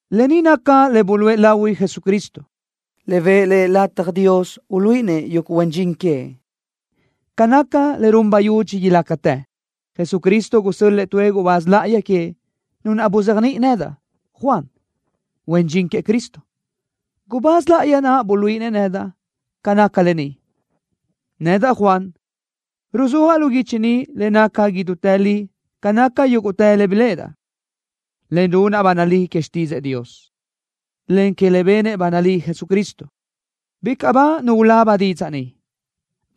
Lë ni naca le buluʼe lahui Jesucristo, le bëʼë Lëʼ lataj Dios uluíʼinëʼ yuguʼ huen dxin queëʼ ca naca le run bayudxi ilácatë. Jesucristo gusö́l-lëʼë tuëʼ gubáz láʼayi queëʼ, nu naʼ buzéajniʼi nedaʼ, Juan, huen dxin queëʼ Cristo. Gubáz láʼayi naʼ buluíʼinëʼ nedaʼ ca naca lë ni. Nedaʼ, Juan, ruzúajaʼ lu guichi ni le naca idútë li ca naca yúguʼtë le biléʼedaʼ, en runaʼ ba nalí que xtídzëʼë Dios, en que le benëʼ ba nalí Jesucristo. Bicaʼ ba nu ulaba didzaʼ ni,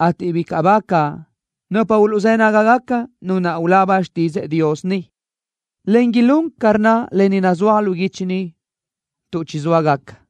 ateʼ bicaʼ bágaca nupa uluʼzë́ nágagaca nu naʼ ulaba xtídzëʼë Dios ni, en ilún ca rnna lë ni nazúaj lu guichi, tuʼ chizóa gaca.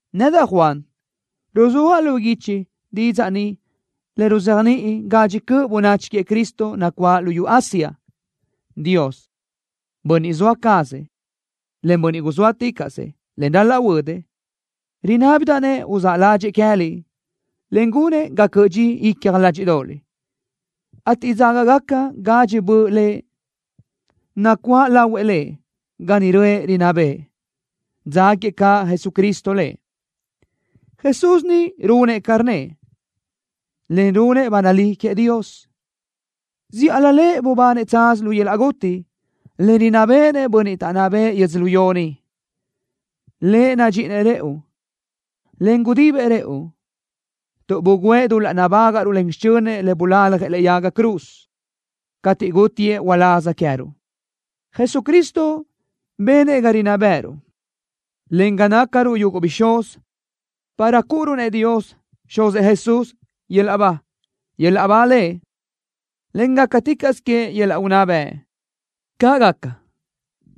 Nedaʼ, Juan, ruzúajaʼ lu guichi didzaʼ ni le uzéajniʼi gadxi cöʼ bönachi queëʼ Cristo nacuáʼ luyú Asia. Dios, Bönniʼ zoa cazëʼ, en guzóaticaʼsëʼ, en ral-laʼ huödëʼ, rinábidaʼ-nëʼ uzáʼ ládxëʼë queë́liʼ, en gunëʼ ga cöʼö dxi icja ládxiʼdoʼoliʼ, ateʼ dzágagaca gadxi böʼ Lëʼ nacuáʼ lahuëʼ Lëʼ ga niʼ röʼë rinná bëʼë. Dzáguiëʼ caʼ Jesucristo Lëʼ. Jesús ni runëʼ ca rnnëʼ, en runëʼ ba nalí queëʼ Dios. Zíʼalö Lëʼ bubanëʼ tsaz lu yöl-laʼ guti, en rinná béʼenëʼ bönniʼ taʼnná bëʼë yödzölió ni. Lëʼ nadxíʼinëʼ rëʼu, en gudibëʼ rëʼu, tuʼ bugǘëʼ dul-laʼ nabágaʼruʼ len xichönëʼ le bulaljëʼ lëʼe yaga cruz, cateʼ gútiëʼ uláz queë́ruʼ. Jesucristo benëʼ ga rinná bë́ʼëruʼ, en ga nácaruʼ yuguʼ bixúz, para cúʼuruʼ-nëʼ Dios, Xuzëʼ Jesús, yöl-laʼ ba. ¡Yöl-laʼ ba Lëʼ, en gácaticaʼsö queëʼ yöl-laʼ unná bëʼ! ¡Caʼ gaca!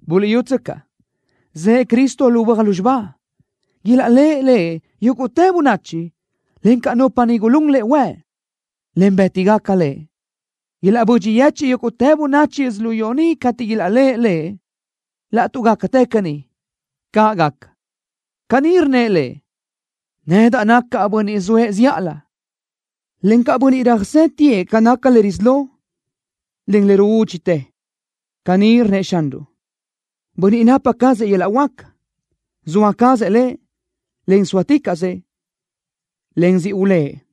¡Buliʼyútsöcaʼ! ¡Zëʼë Cristo lu böaj lúzxiba! ¡Ilaʼléʼe Lëʼ yúguʼtë bönachi, encaʼ nupa niʼ gulún Lëʼ huëʼ, en bë́tigaca Lëʼ! ¡Ilaʼbödxi yechiʼ yúguʼtë bönachi yödzölió ni cateʼ ilaʼléʼe Lëʼ! ¡Laʼtuʼ gácatë caní! ¡Caʼ gaca! Caní rnnëʼ Lëʼ: “Nedaʼ nacaʼ Bönniʼ zoëʼ zíʼalö, encaʼ Bönniʼ röjsétiëʼ ca naca le risí lo, en le ruúdxitë.” Caní rnnëʼ Xanruʼ, Bönniʼ napa cazëʼ yöl-laʼ huáca. ¡Zoa cazëʼ Lëʼ, en guzóaticaʼsëʼ, en siʼ ulë́ʼë!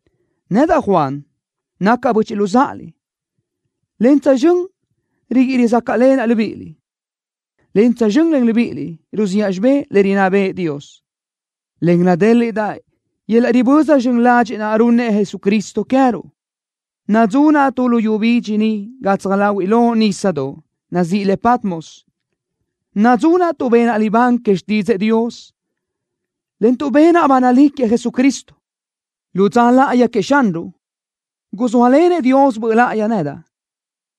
Nedaʼ, Juan, nacaʼ böchiʼ luzáʼaliʼ, en tsözxö́n riguíʼi rizácaʼlenaʼ libíʼiliʼ, en tsözxö́n len libíʼiliʼ ruziʼa xibé le rinná bëʼë Dios, en nadéliʼdaʼ yöl-laʼ riböza zxön ladxiʼ naʼ runnëʼ Jesucristo queë́ruʼ. Nadzunaʼ tu luyú bidxi ni gatsaj láhuiʼlö nísadoʼ, nazíʼi le Patmos. Nadzunaʼ tuʼ benaʼ libán que xtídzëʼë Dios, en tuʼ benaʼ ba nalí queëʼ Jesucristo. Lu dza láʼayi queëʼ Xanruʼ, guzóalenëʼ Dios Böʼ Láʼayi nedaʼ,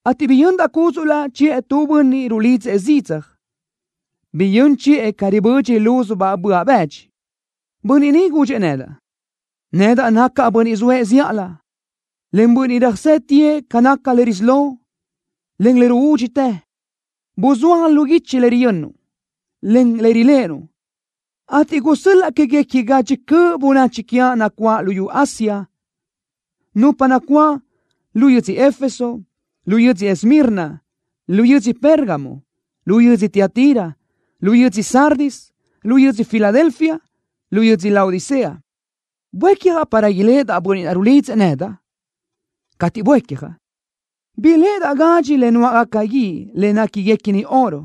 ateʼ biyöndaʼ cúdzuʼlaʼ chiʼë tu bönniʼ rulidzëʼ zidzaj. Biyö́n chiʼë ca ribödxi lúzubaʼ böaʼ bëdxi. Bönniʼ ni gudxëʼ nedaʼ: “Nedaʼ nacaʼ Bönniʼ zoëʼ zíʼalö, en Bönniʼ röjsétiëʼ ca naca le risí lo, en le ruúdxitë. Buzúaj lu guichi le riyönnuʼ, en riléʼenuʼ, ateʼ gusö́l-laʼ le quéguequi gadxi cöʼ bönachi quiaʼ nacuáʼ luyú Asia, nupa nacuáʼ: Lu yödzö Éfeso, lu yödzö Esmirna, lu yödzö Pérgamo, lu yödzö Tiatira, lu yödzö Sardis, lu yödzö Filadelfia, lu yödzö Laodicea.” Buécjaʼ para iléʼedaʼ Bönniʼ naʼ rulidzëʼ nedaʼ. Cateʼ buécjaʼ, biléʼedaʼ gadxi le nuáʼgaca guíʼ le néquiguequini oro.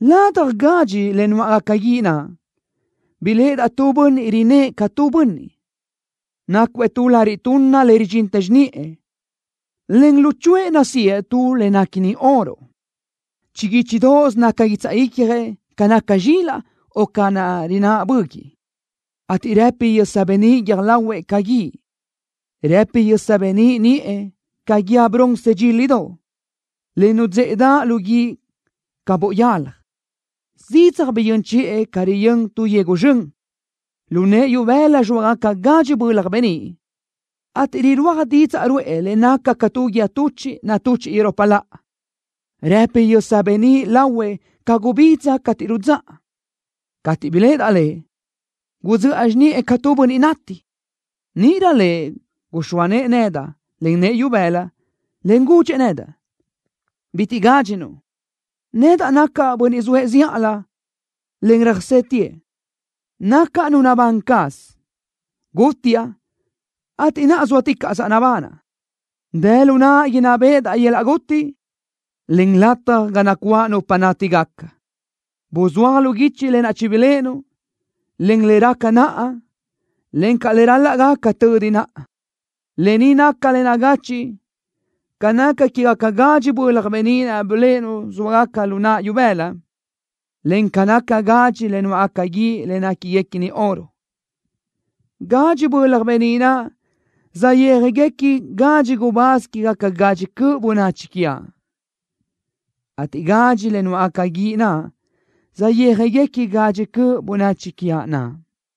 Ladaj gadxi le nuáʼgaca guíʼ naʼ biléʼedaʼ tu Bönniʼ rinë́ʼë ca tu bönniʼ. Nácuëʼ tu lariʼ tunna le ridxín xiniʼë, en luchuʼë nasíëʼ tu le néquini oro. Chiguíchidoʼos naca guitsaʼ icjëʼ ca naca zxilaʼ o ca rináʼ böguiʼ, ateʼ rëpi yösa beníʼ guiö́j lahuëʼ ca guíʼ. Rëpi yösa beníʼ niʼë ca guíë bronce dxílidoʼ, le nudzéʼedaʼ lu guíʼ ca boʼ yalaj. Zidzaj biyö́n chiʼë ca riyö́n tu yegu zxön. Lu nëʼë ibëla zxóagacabaʼ gadxi bölaj beníʼ, ateʼ rirúaj didzaʼ ruʼë le naca ca tu guíë tuchiʼ natuchiʼ iropa laʼa. Rëpi yösa beníʼ lahuëʼ ca gubidza cateʼ rudzáʼa. Cateʼ biléʼedaʼ Lëʼ gudzöʼa xiniʼë ca tu bönniʼ nati. Níʼirö Lëʼ guxóa nëʼë nedaʼ len nëʼë ibëla, en gudxëʼ nedaʼ: “Bitiʼ gádxinuʼ. Nedaʼ nacaʼ Bönniʼ zoëʼ zíʼalö, en röjsétiëʼ. Nacaʼ Nu nabán caz. Gútiaʼ, ateʼ naʼa zóatícaʼsaʼ nabanaʼ. Dë lu naʼa inná béʼedaʼ yöl-laʼ guti, en lataj ga nacuáʼ nupa nátigaca. Buzúaj lu guichi lë naʼ chibiléʼenuʼ, en le raca naʼa, encaʼ le ral-laʼ gaca tödi naʼa. Lë ni naca le nagachiʼ ca naca quégacabaʼ gadxi bölaj beníʼ naʼ biléʼenuʼ zxóagacabaʼ lu naʼa ibëla, en ca naca gadxi le nuáʼgaca guíʼ le néquiguequini oro. Gadxi bölaj beníʼ naʼ saʼyéajgacabaʼ gadxi gubáz quégaca gadxi cöʼ bönachi quiaʼ, ateʼ gadxi le nuáʼgaca guíʼ naʼ saʼyéajgaca gadxi cöʼ bönachi quiaʼ naʼ.”